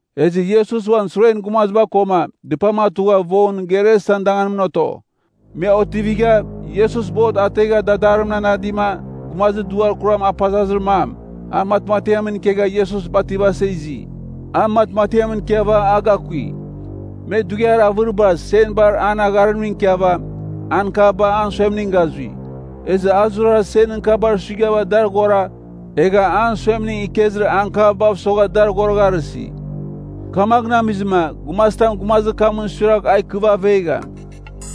Ezɨ Iesus uan suren gumaziba koma dɨpam atugha vongɨn Gerasan danganimɨn oto. Me otivigha, Iesus bot ategha dadarimɨn anadima gumazir duar kuram apazazir mam, a matmatiamɨn ikegha Iesus bativasa izi. A matmatiamɨn ikiava a gakui. Me dughiar avɨriba senbar an agharimning ikiava, ankavba an suemning gazui. Ezɨ a zurara senɨn kabar suighava dar aghora egha an suemning ikezir ankavbav sogha dar aghoragharɨsi. Kamaghɨn amizɨma gumazitam gumazir kamɨn suiragh a ikɨva avegham.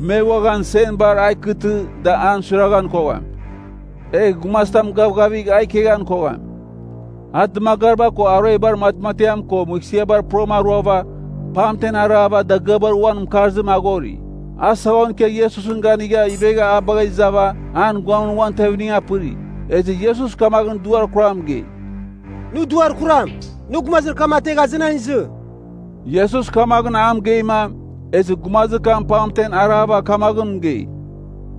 Me uaghan senbar a ikeghtɨ da an suiraghan kogham. Egh gumazitam gavgavigh a ikeghan kogham. A dɨmagariba ko aruebar matmatiam ko mɨghsɨabar purama aruava pamtem arava dagɨabar uabɨ uan mɨkarzim aghori. A saghon ikia Iesusɨn ganigha ivegha a bagha izava an guamɨn uan tevimning apɨri. Ezɨ Iesus kamaghɨn duar kuram mɨgei, “Nɨ duar kuram, nɨ gumazir kam ategh azenan izɨ.” Iesus kamaghɨn a mɨgeima, ezɨ gumazir kam pamtem arava kamaghɨn mɨgei,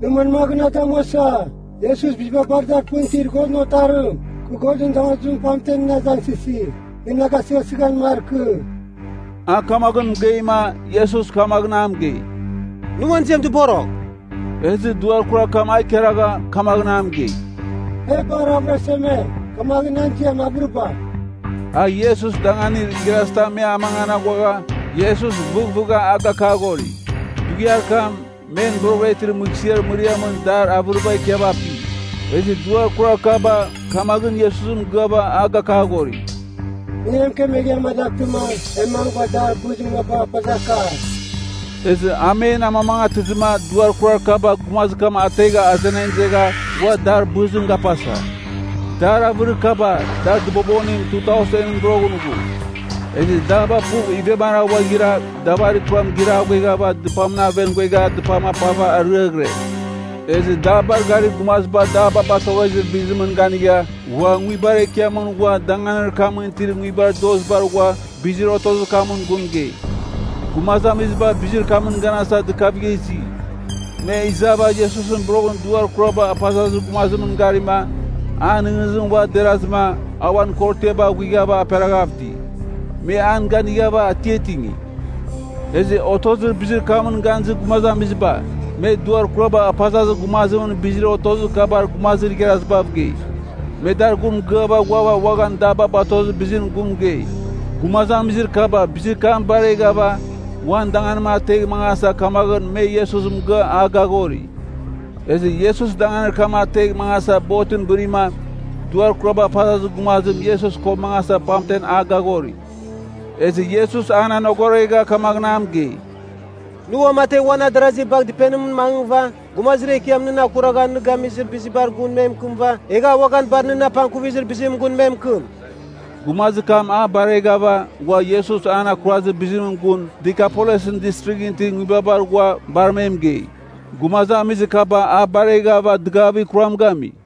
“Nɨ manmaghɨn na damuasa, Iesus biziba bar dar pɨn itir Godɨn Otarim. Kɨ Godɨn damazimɨn pamtem nɨn azangsɨsi, nɨ na gasɨghasɨghan markɨ.” A kamaghɨn mɨgeima Iesus kamaghɨn a mɨgei, “Nɨ uan ziam dɨborogh.” Ezɨ duar kurar kam a ikaragha kamaghɨn a mɨgei, “E bar avɨraseme, kamaghɨn nan ziam Avɨriba.” A Iesus danganir igharazitam me amangan aghuagha Iesus vɨvɨgha a gakaghori. Dughiar kam, men boroghɨra itir mɨghsɨar mɨriamɨn dar avɨriba ikiava api. Ezɨ duar kurar kaba kamaghɨn Iesus mɨgɨava a gakaghori, “Nɨ e mɨkemegh e amadaghtɨma e mangɨva dar bɨzir munabagh apazaka.” Ezɨ a men amamangatɨzɨma duar kurar kaba gumazir kam ategha azenan izegha ghua dar bɨzim gapasa. Dar avɨrir kaba, dar dɨbobonim 2,000ɨn boroghɨn ghu. Ezɨ daba puv ivemara ghuaghira davarir kuram giraghueghava dɨpamɨn aven ghuegha dɨpam apava ariaghɨre. Ezɨ dabar garir gumaziba daba batoghezir bizimɨn ganigha ghua nguibar ekiamɨn ghua danganir kamɨn itir nguibar dozibar ghua bizir otozir kamɨn gun mɨgei. Gumazamiziba bizir kamɨn ganasa dɨkavigha izi. Me izava Iesus boroghɨn duar kuraba apazazir gumazimɨn garima, an nɨghnɨzim ua derazɨma, a uan korotiaba aghuighava aperaghav iti. Me an ganighava atiatingi. Ezɨ otozir bizir kamɨn ganizir gumazamiziba, me duar kuraba apazazir gumazimɨn bizir otozir kabar gumazir igharazibav gei. Me dar gun mɨgɨava ghuava uaghan daba batozir bizimɨn gun mɨgei. Gumazamizir kaba bizir kam bareghava uan danganim ategh mangasa kamaghɨn me Iesus mɨgɨa a gaghori. Ezɨ Iesus danganir kam ategh mangasa botɨn bɨrima duar kuraba apazazir gumazim Iesus ko mangasa pamtem a gaghori. Ezɨ Iesus an anogoregha kamaghɨn a mɨgei, “Nɨ uamategh uan adarazi bagh dɨpenimɨn mangɨva Gumazir Ekiam nɨn akuragha nɨ gamizir bizibar gun me mɨkɨmɨva egh a uaghan bar nɨn apangkuvizir bizimɨn gun me mɨkɨm.” Gumazir kam a bareghava ghua Iesus an akurazir bizimɨn gun Dekapolisɨn Distrighɨn itir nguibabar ghua bar me mɨgei. Gumazamizir kaba a bareghava dɨgavir kuram gami.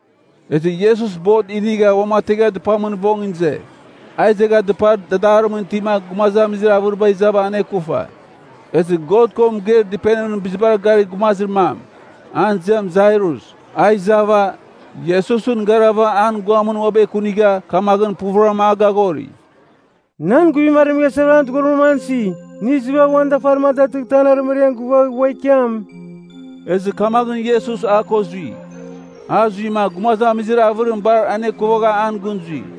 Ezɨ Iesus bot inigha uamategha dɨpamɨn vongɨn ize. A izegha dɨpar dadarimɨn itima gumazamizir avɨriba izava anekufa. Ezɨ God ko mɨgeir dɨpenimɨn bizibar garir gumazir mam, an ziam Jairus, a izava, Iesusɨn garava an guamɨn uabɨ ekunigha kamaghɨn puvɨram a gaghori, “Nan guivim aremeghasa an dɨghorimra isi. Nɨ izɨva uan dafarim a datɨghtɨ an arɨmariam gɨvagh ua ikiam.” Ezɨ kamaghɨn Iesus a ko zui. A zuima gumazamizir avɨriba bar anekuvaghava an gɨn zui.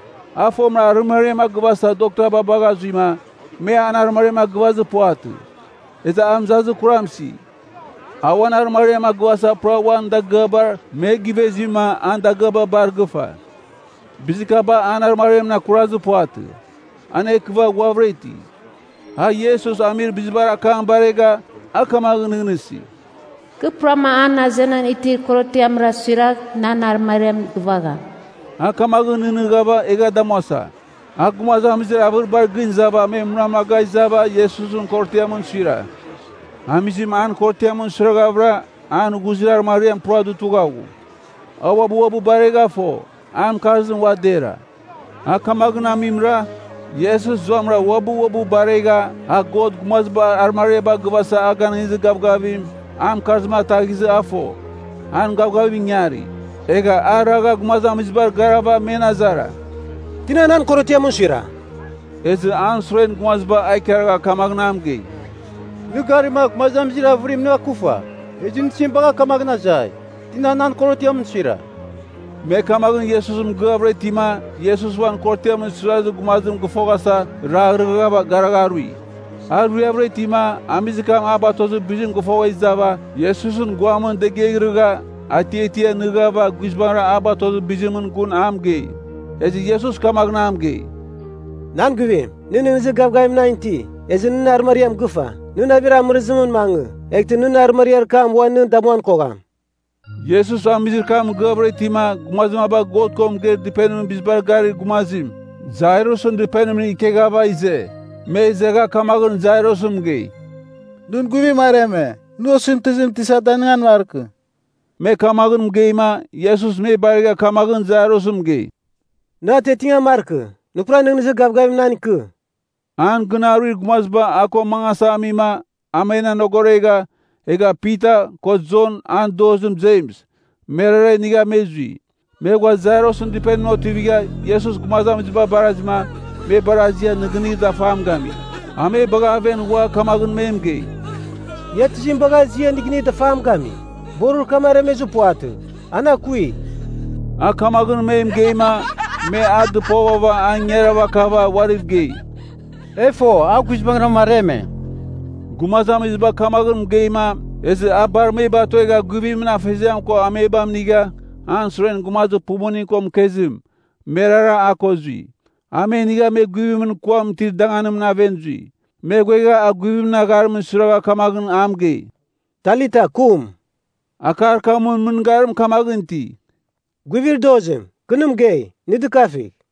A fomɨra arɨmariam a gɨvasava doktaba bagha zuima, me an arɨmariam a gɨvazir puvatɨ. Ezɨ a mɨzazir kuram isi. A uan arɨmariam a gɨvasava pura uan dagɨabar me gɨvezima an dagɨaba bar gɨfa. Bizir kaba an arɨmariamɨn akurazir puvatɨ. An ekɨva ghuavɨra iti. A Iesus amir bizibar akam baregha, a kamaghɨn nɨghnɨsi, “Kɨ puram an azenan itir korotiamra suiragh nan arɨmariam gɨvagham.” A kamaghɨn nɨghnɨghava egha damuasa. A gumazamizir avɨribar gɨn izava me munamaga izava Iesusɨn korotiamɨn suira. Amizim an korotiamɨn suighavɨra, an ghuzir arɨmariam pura dutugha ghu. A uabɨ uabɨ baregha fo, an mɨkarzim ua dera. A kamaghɨn amimra, Iesus zuamɨra uabɨ uabɨ baregha a God gumazibar arɨmariaba gɨvaghasa a ganɨngizir gavgavim, an mɨkarzim ataghizɨ a fo, nan gavgavim ingari. Egha a ragha gumazamizibar garava men azara, “Tina nan korotiamɨn suira?” Ezɨ an suren gumaziba a ikaragha kamaghɨn a mɨgei, “Nɨ garima, gumazamizir avɨriba nɨ akufa. Ezɨ nɨ tizim bagha kamaghɨn azai, ‘Tina nan korotiamɨn suira?’” Me kamaghɨn Iesus mɨgɨavɨra itima Iesus uan korotiamɨn suirazir gumazim gɨfoghasa raghrɨgha garagharui. A ruiavɨra itima, amizir kam a batozir bizim gɨfogha izava Iesusɨn guamɨn degiaghrɨgha, atiatia nɨghava guizbangɨra a batozir bizimɨn gun a mɨgei. Ezɨ Iesus kamaghɨn a mɨgei, “Nan guivim, nɨ nɨghnɨzir gavgavim nan iti. Ezɨ nɨn arɨmariam gɨfa. Nɨ navir amɨrɨzimɨn mangɨ, eghtɨ nɨn arɨmariar kam ua nɨ damuan kogham.” Iesus amizir kam mɨgɨavɨra itima gumazir maba God ko mɨgeir dɨpenimɨn bizibar garir gumazim, Jairusɨn dɨpenimɨn ikeghava ize. Me izegha kamaghɨn Jairus mɨgei, “Nɨn guivim areme. Nɨ osɨmtɨzim Tisa danɨngan markɨ.” Me kamaghɨn mɨgeima Iesus me baregha kamaghɨn Jairus mɨgei, “Nɨ atiatingan markɨ. Nɨ pura nɨghnɨzir gavgavim nan ikɨ.” An gɨn aruir gumaziba a ko mangasa amima a men anogoregha, egha Pita, ko Jon an dozim Jems, merara inigha me zui. Me ghua Jairusɨn dɨpenimɨn otivigha Iesus gumazamiziba barazima, me bar azia nɨgɨnir dafam gami. A me bagha aven ghua kamaghɨn me mɨgei, “Ia tizim bagha azia nɨgɨnir dafam gami? Borir kam aremezir puvatɨ. An akui.” A kamaghɨn me mɨgeima, me a dɨpovava an ingarava kava uariv gei, “E fo, a guizbangɨram areme.” Gumazamiziba kamaghɨn mɨgeima ezɨ a bar me batuegha guivimɨn afeziam ko amebam inigha an suren gumazir pumuning ko mɨkezim, merara a ko zui. A me inigha me guivimɨn kuam itir danganimɨn aven zui. Me ghuegha a guivimɨn agharim suiragha kamaghɨn a mɨgei, “Talita kum!” (Akar kamɨn mɨngarim kamaghɨn iti, “Guivir dozim, kɨ nɨ mɨgei, nɨ dɨkafigh!”)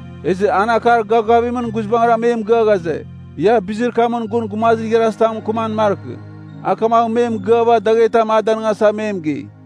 Ezɨ an akar gavgavimɨn guizbangɨra me mɨgɨa ghaze, ia bizir kamɨn gun gumazir igharazitam mɨkɨmam markɨ. A kamaghɨn me mɨgɨava daghetam a danɨngasa me mɨgei.